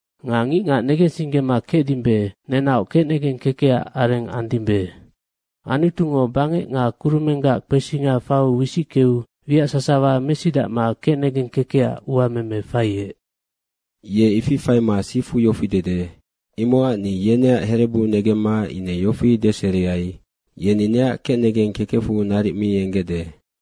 Nga ngicngac negensinggema kecdimbe, nenaoc kecnegeng kekecac areng andimbe. Anutungo bangec nga kurumenggac kpesinga faiu wisickeu wiac sasawa mesidacma kecnegeng kekecac uameme faiec. Ye ifi faima sifu yofi dede, “Imocac ni yeneac herebu negemma ine yofi deseriai, ‘Yeni neac kecnegeng kekecfu naric mi enggecde.’”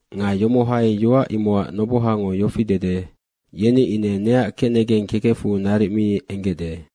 Nga yomohai yoac imocac nobohango yofi dede, “Yeni ine neac kecnegeng kekecfu naric mi enggecde.”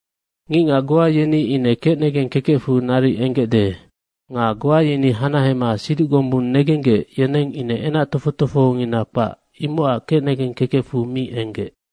Ngicngac goa yeni ine kecnegeng kekecfu naric enggecde. Nga goa yeni hanahema siduc gombung negenggec, yeneng ine enac tofoc tofohongina kpac, imocac kecnegeng kekecfu mi enggec.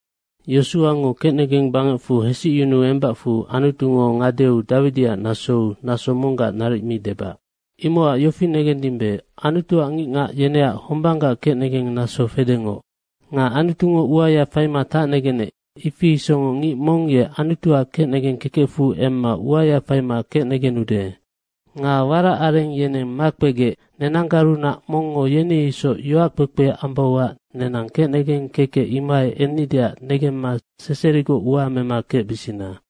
Yosuango kecnegeng bangecfu hesicyunu embacfu Anutungo ngadeu Dawidiac nasou naso monggac naric mi debac. Imocac yofi negendimbe, Anutuac ngicngac yeneac hombanggac kecnegeng naso fedengoc. Nga Anutungo uaya faima tacnegenec, ifi isocngoc ngic mong ye Anutuac kecnegeng kekecfu emma uaya faima kecnegenude. Nga warac areng yeneng makpegec, nenanggarunac mongngo yeni isoc yoac kpekpe ambauac nenang kecnegeng kekec imohai ennideac negemma seserigoc ua mema kecbisina.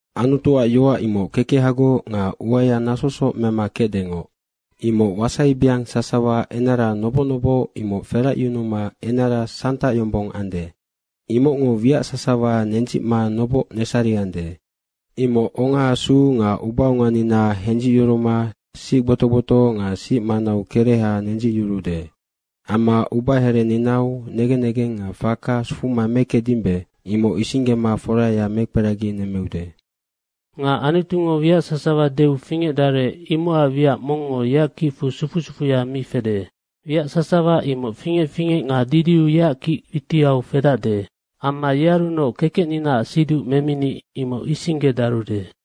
Anutuac yoac imoc kekehagoc nga uaya nasosoc mema kecdengoc. Imoc wasaibeang sasawa enara noboc noboc imoc feracyunuma enara santac yombong ande. Imocngo wiac sasawa nendzicma noboc nesariande. Imoc ongaasu nga ubaonganina hendzicyuruma sic gbotoc gbotoc nga sic manau kereha nendzicyuruude. Amma ubahereninau negen nengeng nga faka sufuma mekecdimbe, imoc isinggema foraya mekperaginemmeude. Nga Anutungo wiac sasawa deu fingecdarec imocac wiac mongngo yeac kicfu sufu sufuya mi fede. Wiac sasawa imoc fingec fingec nga didiu yeac kic witiau fedacde amma yearunoc kekecninaac siduc memini imoc isinggedarude.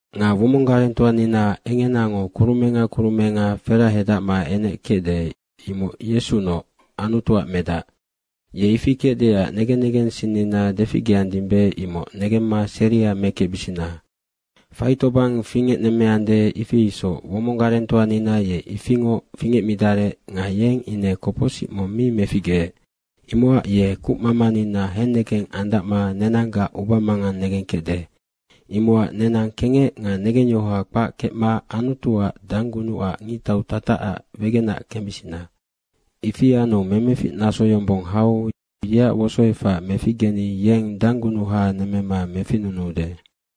Nga womong garengtoanina engenango kurumenga kurumenga ferahedacma enec kecde, imoc Yesunoc, Anutuac Medac. Ye ifi kecdeac negen negensinnina deficgeandimbe, imoc negemma seria mekecbisina. Faitobang fingecnemmeande, ifi isoc womong garengtoanina ye ifingoc fingecmidarec nga yeng ine kopocsic mong mi meficgeec. Imocac ye kucmamanina hennegeng andacma nenanggac ubamangang negengkecde. Imocac nenang kengec nga negengyohoa kpac kecma Anutuac danggunucac ngictau tatacac wegenac kembisina. Ifi anu memefic naso yombong hau yeac wosoefac meficgeni yeng danggunuha nemmema meficnunuude.